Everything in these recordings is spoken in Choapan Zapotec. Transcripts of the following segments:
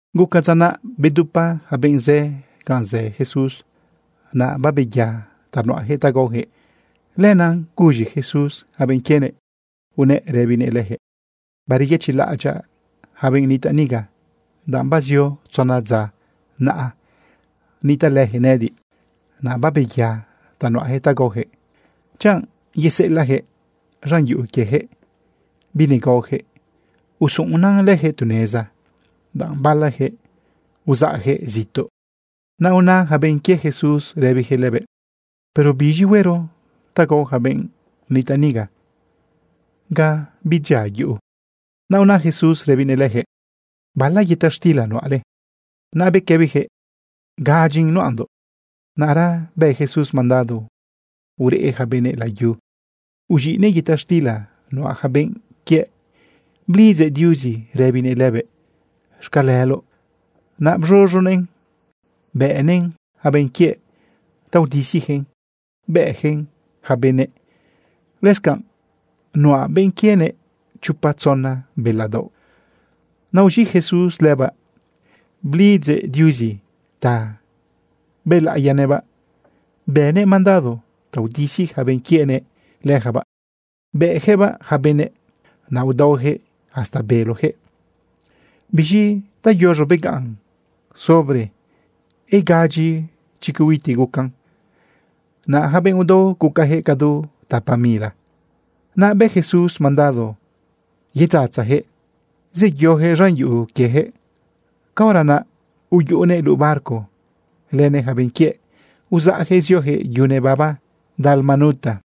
Guca dza naꞌ bedupa yaca benꞌ zë ganꞌ zë Jesús. Naꞌ babeya ta nuꞌayaquëꞌ ta gaoyaquëꞌ. Lenaꞌ guz̃i Jesús yaca benꞌ quienëꞌ, unëꞌ rëbinëꞌ leyaquëꞌ: ―Bareyëchiꞌlaꞌadyaꞌ yaca benꞌ nitaꞌ niga, danꞌ bazio tzona dza naꞌa nitaꞌlëyaquëꞌ nëꞌëdiꞌ, naꞌ babeya ta nuꞌayaquëꞌ ta gaoyaquëꞌ. Chanꞌ yeseꞌelaꞌyaquëꞌ z̃an yuꞌu quieyaquëꞌ binegaoyaquëꞌ, usuꞌunan leyaquëꞌ tu neza, danꞌ balayaquëꞌ uzaꞌyaquëꞌ zituꞌ. Naꞌ una yaca benꞌ quie Jesús rëbiyaquëꞌ lëbëꞌ: ―¿Pero biz̃i huero ta gao yaca benꞌ nitaꞌ niga ga bidyia yuꞌu? Naꞌ una Jesús rëbinëꞌ leyaquëꞌ: ―¿Bala yëta xtila nuꞌale? Naꞌ bequëbiyaquëꞌ: ―Gadyin nuꞌandoꞌ. Naꞌra bë Jesús mandado ureꞌ yaca benëꞌ layu, uz̃iꞌnëꞌ yëta xtila nuꞌa yaca benꞌ quiëꞌ, blidzëꞌ Diuzi rëbinëꞌ lëbëꞌ: “Xcaleloꞌ.” Naꞌ bz̃uz̃uguëꞌn bëꞌnëꞌn yaca benꞌ quiëꞌ ta udisiyaquëꞌn bëꞌyaquëꞌn yaca benëꞌ. Lëscanꞌ nuꞌa benꞌ quienëꞌ chopa tzona bela daoꞌ. Naꞌ uz̃iꞌ Jesús lëbaꞌ, blidzëꞌ Diuzi ta bëlaꞌiyanëꞌbaꞌ, bënëꞌ mandado ta udisi yaca benꞌ quienëꞌ leyacabaꞌ, bëꞌyaquëꞌbaꞌ yaca benëꞌ. Naꞌ udaoyaquëꞌ hasta beloyaquëꞌ. Biz̃i tayuz̃o begaꞌn sobre igadyi chicuiti gucan. Naꞌ yaca benꞌ udao gucayaquëꞌ cadu tapa mila. Naꞌ bë Jesús mandado yedzatzayaquëꞌ zeyoyaquëꞌ z̃an yuꞌu quieyaquëꞌ. Caora naꞌ uyuꞌunëꞌ luꞌu barco lënëꞌ yaca benꞌ quiëꞌ uzaꞌyaquëꞌ zioyaquëꞌ yu nebaba Dalmanuta.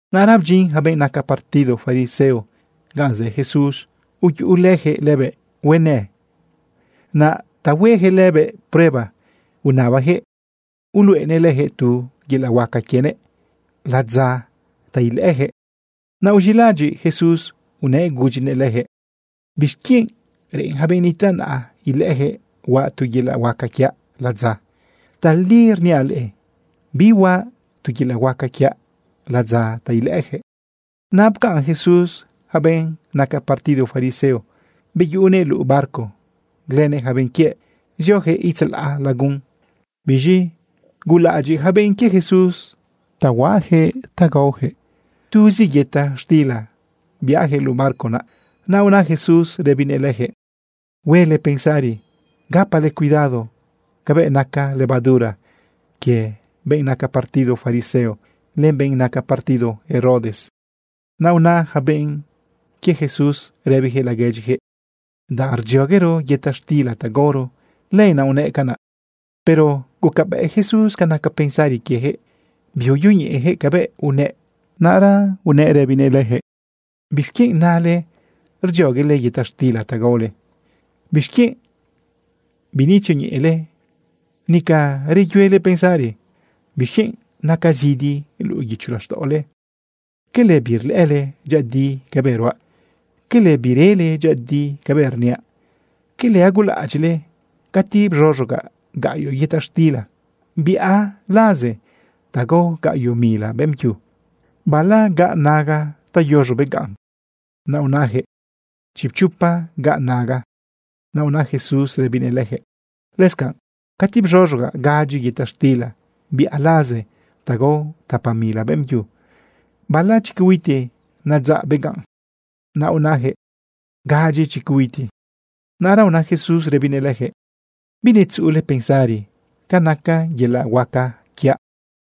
Naꞌra bdyin yaca benꞌ naca partido fariseo ganꞌ zë Jesús, uyuꞌulëyaquëꞌ lëbëꞌ huenë. Naꞌ ta hueyaquëꞌ lëbëꞌ prueba unabayaquëꞌ uluꞌenëꞌ leyaquëꞌ tu yelaꞌ huaca quienëꞌ ladza ta ilëꞌëyaquëꞌ. Naꞌ uz̃iꞌlaꞌadyiꞌ Jesús unëꞌ gudyinëꞌ leyaquëꞌ: ―¿Bixquienꞌ reꞌen yaca benꞌ nitaꞌ naꞌa ilëꞌëyaquëꞌ huaꞌ tu yelaꞌ huaca quiaꞌ ladza? Tali rniaꞌ leꞌe, bihuaꞌ tu yelaꞌ huaca quiaꞌ ladza ta ilëꞌëyaquëꞌ. Naꞌ pcaꞌn Jesús yaca benꞌ naca partido fariseo, beyuꞌunëꞌ luꞌu barco lënëꞌ yaca benꞌ quiëꞌ, zioyaquëꞌ itzalaꞌ lagun. Biz̃i gulaꞌadyiꞌ yaca benꞌ quie Jesús ta nuꞌayaquëꞌ ta gaoyaquëꞌ. Tuzi yëta xtila biꞌayaquëꞌ luꞌu barco naꞌ. Naꞌ una Jesús rëbinëꞌ leyaquëꞌ: ―Huele pensari. Gapale cuidado cabëꞌ naca levadura quie benꞌ naca partido fariseo, len benꞌ naca partido Herodes. Naꞌ una yaca benꞌ quie Jesús rëbiyaquëꞌ laguedyiyaquëꞌ: ―Danꞌ rdzioguero yëta xtila ta gaoro, lenaꞌ unëꞌ canaꞌ. Pero gucabëꞌ Jesús ca naca pensari quieyaquëꞌ biuyoñeꞌeyaquëꞌ cabëꞌ unëꞌ. Canaꞌ unëꞌ rëbinëꞌ leyaquëꞌ: ―¿Bixquienꞌ nale rdzioguele yëta xtila ta gaole? ¿Bixquienꞌ binetzioñeꞌele, nica reyuele pensari? ¿Bixquienꞌ naca zidi luꞌu guicho laxtaꞌole? ¿Quele birlëꞌële dyëꞌëdi cabëꞌ ruaꞌ? ¿Quele birele dyëꞌëdi cabëꞌ rniaꞌ? ¿Quele agulaꞌadyiꞌle? Cati bz̃uz̃ugaꞌ gaꞌyoꞌ yëta xtila biaꞌ laze ta gao gaꞌyoꞌ mila beꞌmbyu, ¿bala gaꞌ naga ta yuz̃o begaꞌn? Naꞌ unayaquëꞌ: ―Chipchopa gaꞌ naga. Naꞌ una Jesús rëbinëꞌ leyaquëꞌ: ―Lëscanꞌ cati bz̃uz̃ugaꞌ gadyi yëta xtila biaꞌ laze ta gao tapa mila beꞌmbyu, ¿bala chicuiti nadzaꞌ begaꞌn? Naꞌ unayaquëꞌ: ―Gadyi chicuiti. Naꞌra una Jesús rëbinëꞌ leyaquëꞌ: ―¿Binetzuꞌule pensari ca naca yelaꞌ huaca quiaꞌ?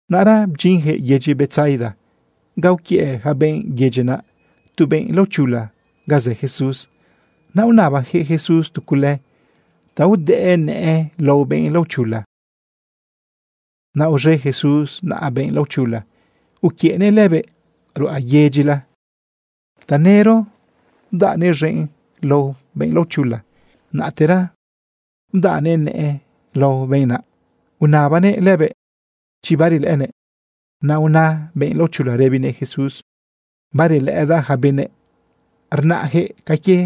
Naꞌra bdyinyaquëꞌ yedyi Betsaida ga uquiëꞌ yaca benꞌ yedyi naꞌ tu benꞌ laochula ga zë Jesús. Naꞌ unabayaquëꞌ Jesús tu cule ta udëꞌë nëꞌë lao benꞌ laochula. Naꞌ uz̃e Jesús naꞌa benꞌ laochula uquiëꞌnëꞌ lëbëꞌ ruꞌa yedyila. Tanëro bdaꞌnëꞌ z̃enꞌ lao benꞌ laochula, naꞌtera bdaꞌnëꞌ nëꞌë lao benꞌ naꞌ, unabanëꞌ lëbëꞌ chi barelëꞌënëꞌ. Naꞌ una benꞌ laochula rëbinëꞌ Jesús: ―Barelëꞌëdaꞌ yaca benëꞌ. Rnaꞌyaquëꞌ ca quie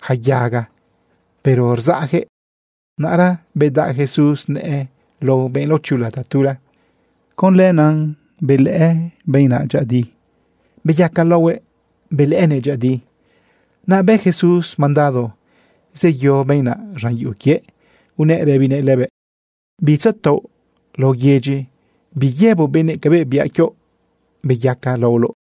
yaca yaga, pero rzaꞌyaquëꞌ. Naꞌra bedaꞌ Jesús nëꞌë lao benꞌ laochula tatula. Con canaꞌ benaꞌ benꞌ naꞌ dyëꞌëdi, beyaca laohuëꞌ, belëꞌënëꞌ dyëꞌëdi. Naꞌ bë Jesús mandado zeyo benꞌ naꞌ z̃an yuꞌu quiëꞌ, unëꞌ rëbinëꞌ lëbëꞌ: ―Bitzataoꞌ laꞌo yedyi. Biyëboꞌ benëꞌ cabëꞌ biaꞌ quioꞌ beyaca laoloꞌ.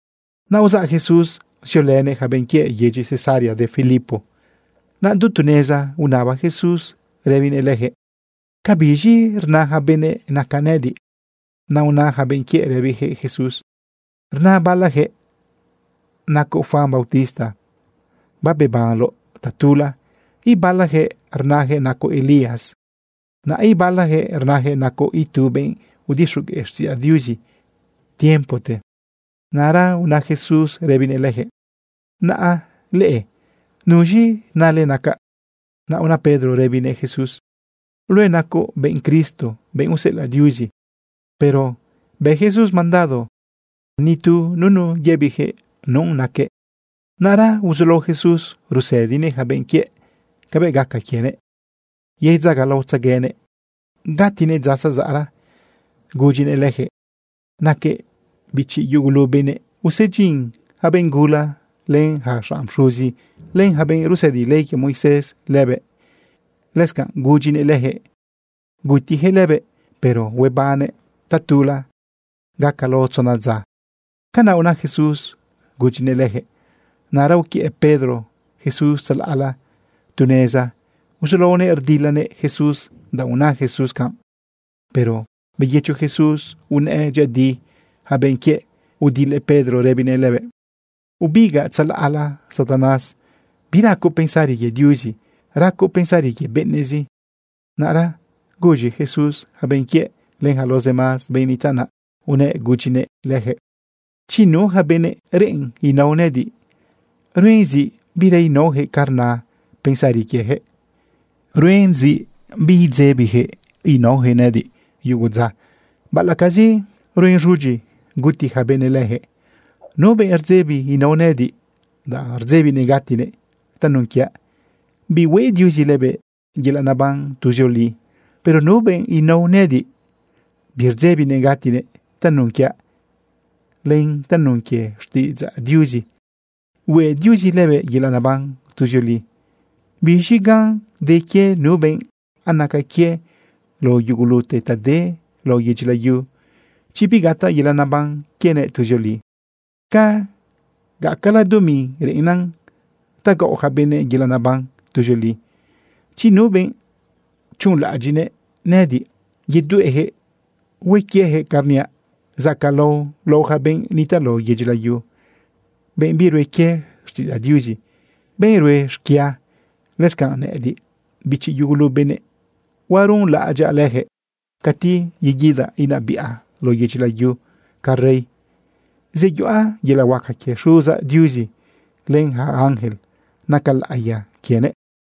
Naꞌ uzaꞌ Jesús ziolënëꞌ yaca benꞌ quiëꞌ yedyi Cesarea de Filipo. Naꞌ du tu neza unaba Jesús rëbinëꞌ leyaquëꞌ: ―¿Cabiz̃i rna yaca benëꞌ nacaꞌ nëꞌëdiꞌ? Naꞌ una yaca benꞌ quiëꞌ rëbiyaquëꞌ Jesús: ―Rna balayaquëꞌ nacoꞌ Juan bautista, babebanloꞌ tatula. Ibalayaquëꞌ rnayaquëꞌ nacoꞌ Elías, naꞌ ibalayaquëꞌ rnayaquëꞌ nacoꞌ itu benꞌ udixogueꞌ xtiꞌidzaꞌ Diuzi tiempote. Naꞌra una Jesús rëbinëꞌ leyaquëꞌ: ―Naꞌ leꞌe, ¿nuz̃i nale nacaꞌ? Naꞌ una Pedro rëbinëꞌ Jesús: ―Luëꞌ nacoꞌ benꞌ Cristo, benꞌ useꞌelaꞌ Diuzi. Pero bë Jesús mandado ta nitu nunu yëbiyaquëꞌ nu naquëꞌ. Naꞌra uzulao Jesús rusëdinëꞌ yaca benꞌ quiëꞌ cabëꞌ gaca quienëꞌ yedzagalaotzeguenëꞌ gatinëꞌ dza zazaꞌra. Gudyinëꞌ leyaquëꞌ naquëꞌ bichi yugulu benëꞌ, usebiꞌn yaca benꞌ gula, len yaca xanꞌ pxuzi, len yaca benꞌ rusëdi ley quie Moisés lëbëꞌ. Lëscanꞌ gudyinëꞌ leyaquëꞌ gutiyaquëꞌ lëbëꞌ, pero huebannëꞌ tatula gaca lao tzona dza. Canaꞌ una Jesús gudyinëꞌ leyaquëꞌ. Naꞌra uquiëꞌ Pedro Jesús tzalaꞌla tu neza uzulaonëꞌ rdilanëꞌ Jesús, danꞌ una Jesús canꞌ. Pero beyëcho Jesús unëꞌë dyëꞌëdi yaca benꞌ quiëꞌ, udilëꞌ Pedro rëbinëꞌ lëbëꞌ: ―Ubigaꞌ tzalaꞌla Satanás. Biracoꞌ pensari quie Diuzi, racoꞌ pensari quie benëꞌzi. Naꞌra guz̃i Jesús yaca benꞌ quiëꞌ len yaca los demás benꞌ nitaꞌ naꞌ, unëꞌ gudyinëꞌ leyaquëꞌ: ―Chi nu yaca benëꞌ reꞌen inao nëꞌëdiꞌ, ruen zi bira inaoyaquëꞌ ca rna pensari quieyaquëꞌ. Ruen zi bidzebiyaquëꞌ inaoyaquëꞌ nëꞌëdiꞌ yugu dza, baꞌalaꞌcazi ruen z̃udyi guti yaca benëꞌ leyaquëꞌ. Nu benꞌ rdzebi inao nëꞌëdiꞌ, danꞌ rdzebinëꞌ gatinëꞌ tanun quiaꞌ, bihueꞌ Diuzi lëbëꞌ yelaꞌ neban tuzioli. Pero nu benꞌ inao nëꞌëdiꞌ, birdzebinëꞌ gatinëꞌ tanun quiaꞌ len tanun quie xtiꞌidzaꞌ Diuzi, hueꞌ Diuzi lëbëꞌ yelaꞌ neban tuzioli. ¿Biz̃i gan de quie nu benꞌ anaca quiëꞌ lao yugulute ta de lao yedyi layu, chi bigataꞌ yelaꞌ neban quienëꞌ tuzioli? ¿Ca gacala dumi reꞌennan ta gaꞌo yaca benëꞌ yelaꞌ neban tuzioli? Chi nu benꞌ chuꞌunlaꞌadyiꞌ nëꞌëdiꞌ yedueꞌyaquëꞌ hue quieyaquëꞌ canꞌ rniaꞌ zacaꞌlao lao yaca benꞌ nitaꞌ lao yedyi layu, benꞌ birue quie xtiꞌidzaꞌ Diuzi, benꞌ rue xquia, lëscanꞌ nëꞌëdiꞌ, bichi yugulu benëꞌ, huaruꞌunlaꞌadyaꞌ leyaquëꞌ cati yeguidaꞌ inabiꞌa lao yedyi layu ca rey. Zeyuꞌa yelaꞌ huaca quie Xuzaꞌ Diuzi len yaca ángel naca laꞌiya quienëꞌ.